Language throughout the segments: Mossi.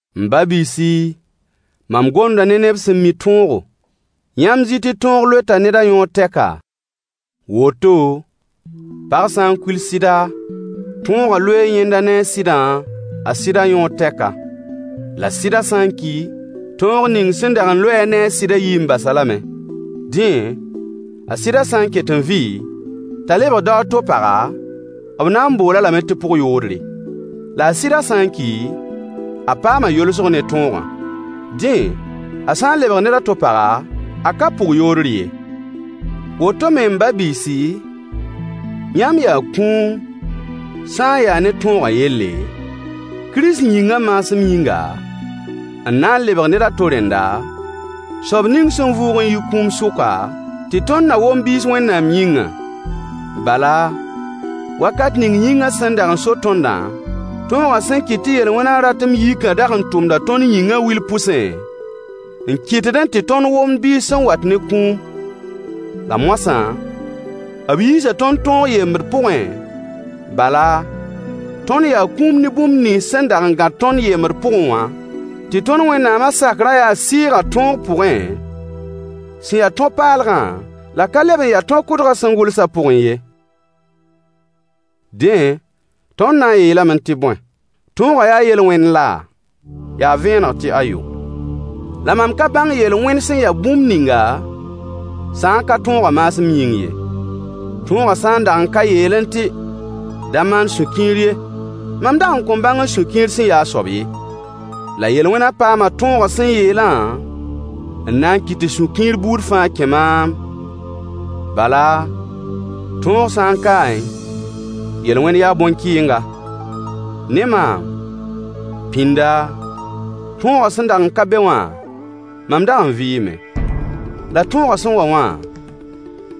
M ba-biisi, mam gomda ne neb sẽn mi tõogo: Yãmb zɩ tɩ tõog loeta ned a yõor tɛka? Woto, pag sã n kuil sɩda, tõogã loee yẽndã ne a sɩdã a sɩdã yõor tɛka. La sɩdã sã n ki, tõog ning sẽn dag n loe-a ne a sɩdã yii n bas-a lame. Dẽ, a sɩdã sã n ket n vɩ, t'a lebg dao a to paga, b na n bool-a lame tɩ pʋg-yoodre. La a sɩdã sã n ki, a paama yolsg ne tõogã. Dẽ, a sã n lebg ned a to paga, a ka pʋg-yoodr ye. Woto me m ba-biisi, yãmb yaa kũum, sã n yaa ne tõogã yelle, Kirist yĩngã maasem yĩnga, n na n lebg ned a to rẽnda, soab ning sẽn vʋʋg n yi kũum sʋka, tɩ tõnd na wom biis Wẽnnaam yĩngã. Bala, wakat ning yĩngã sẽn dag n so tõndã, tõogã sẽn kɩt tɩ yel-wẽnã ratem yikã dag n tʋmda tõnd yĩngã wil pʋsẽ, n kɩtdẽ tɩ tõnd womd biis sẽn wat ne kũum. La moasã, b yiisa tõnd tõog yembd pʋgẽ, bala, tõnd yaa kũum ne bũmb nins sẽn dag gãd tõnd yembd pʋgẽ wã, tɩ tõnd Wẽnnaamã sakrã yaa sɩɩgã tõog pʋgẽ, sẽn ya tõ-paalgã, la ka leb n ya tõ-kʋdgã sẽn gʋlsã pʋgẽ ye. Dẽ, tõnd na n yeelame tɩ bõe? Tõogã yaa yel-wẽnd la? Yaa vẽeneg tɩ ayo. La mam ka bãng yel-wẽn sẽn ya bũmb ninga, sã n ka tõogã maasem yĩng ye. Tõogã sã n dag n ka yeelẽ tɩ: Da maan sũ-kiir ye, mam dag n kõn bãng sũ-kiir sẽn yaa a soab ye. La yel-wẽnã paama tõogã sẽn yeelã n na n kɩt tɩ sũ-kiir buud fãa kẽ maam, bala, tõog sã n kaẽ, yel-wẽn yaa bõn-kɩɩnga. Ne maam, pĩnda, tõogã sẽn dag n ka be wã, mam dag n vɩɩme. La tõogã sẽn wa wã,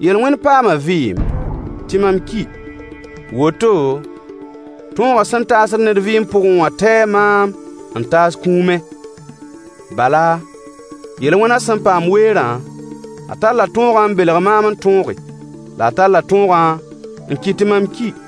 yel-wẽn paama vɩɩm, tɩ mam ki. Woto, tõogã sẽn taasd ned vɩɩm pʋgẽ wã taee maam n taas kũumẽ. Bala, yel-wẽnã sẽn paam weerã, a talla tõogã n belg maam n tõoge, la a talla tõogã n kɩt tɩ mam ki.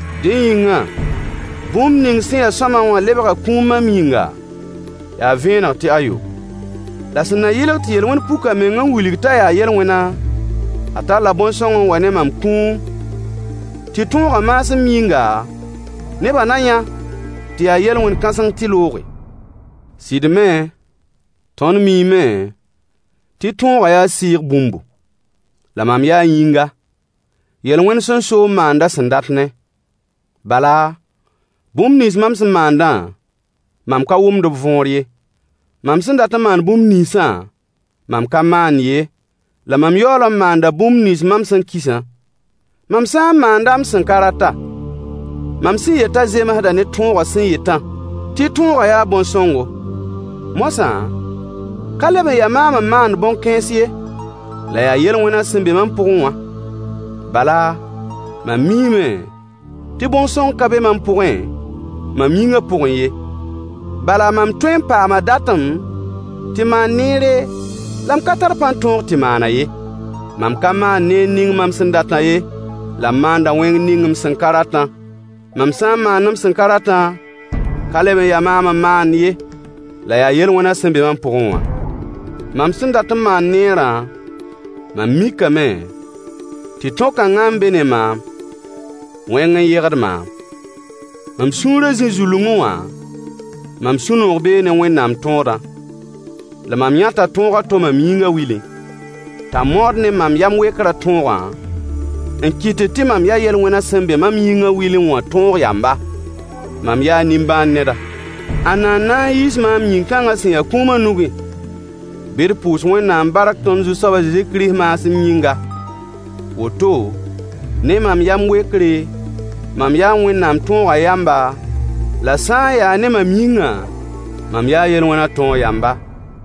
Dẽ yĩngã, bũmb ning sẽn ya sõama wã lebga kũum mam yĩnga? Yaa vẽeneg tɩ ayo. La sẽn na yɩlg tɩ yel-wẽn puk a meng n wilg t'a yaa yel-wẽnã, a talla bõn-sõng n wa ne mam kũum, tɩ tõogã maasem yĩnga nebã na yã tɩ yaa yel-wẽn kãseng tɩ looge. Sɩd me, tõnd miime tɩ tõogã yaa sɩɩg bũmbu. La mam yaa yĩnga, yel-wẽn sẽn so n maand a sẽn dat-ne. Bala, bũmb nins mam sẽn maandã, mam ka wʋmd b võor ye. Mam sẽn dat n maan bũmb ninsã, mam ka maand ye, la mam yaool n maanda bũmb nins mam sẽn kisã. Mam sã n maanda m sẽn ka rata, mam sẽn yetã zemsda ne tõogã sẽn yetã, tɩ tõogã yaa bõn-sõngo. Moasã, ka leb n ya maam n maand bõn-kãens ye, la yaa yel-wẽnã sẽn be mam pʋgẽ wã. Bala, mam miime tɩ bõn-sõng ka be mam pʋgẽ, mam yĩngã pʋgẽ ye. Bala mam tõee n paama datem tɩ maan neere, la m ka tar pãn-tõog tɩ maan-a ye. Mam ka maand neer ning mam sẽn datã ye, la m maanda wẽng ning m sẽn ka ratã. Mam sã n maand m sẽn ka ratã, ka leb n ya maam n maand ye, la yaa yel-wẽnã sẽn be mam pʋgẽ wã. Mam sẽn dat n maan neerã, mam mikame tɩ tõ-kãngã n be ne maam: Wẽng n yegd maam. Mam sũurã zĩ-zulungẽ wã, mam sũ-noog bee ne Wẽnnaam tõodã. La mam yãta tõog a to mam yĩnga wilẽ, t'a maood ne mam yam-wekrã tõogã, n kɩtd tɩ mam ya yel-wẽnã sẽn be mam yĩngã wilẽ wã tõog yamba. Mam yaa nĩmbãan-neda. Ãnna n na n yiis maam yĩn-kãngã sẽn ya kũumã nugẽ? Bɩ d pʋʋs Wẽnnaam bark tõnd Zu-soab a Zezi Kirist maasem yĩnga. Woto, ne mam yam-wekre, mam yaa Wẽnnaam tõogã yamba, la sã n yaa ne mam yĩngã, mam yaa yel-wẽnã tõog yamba.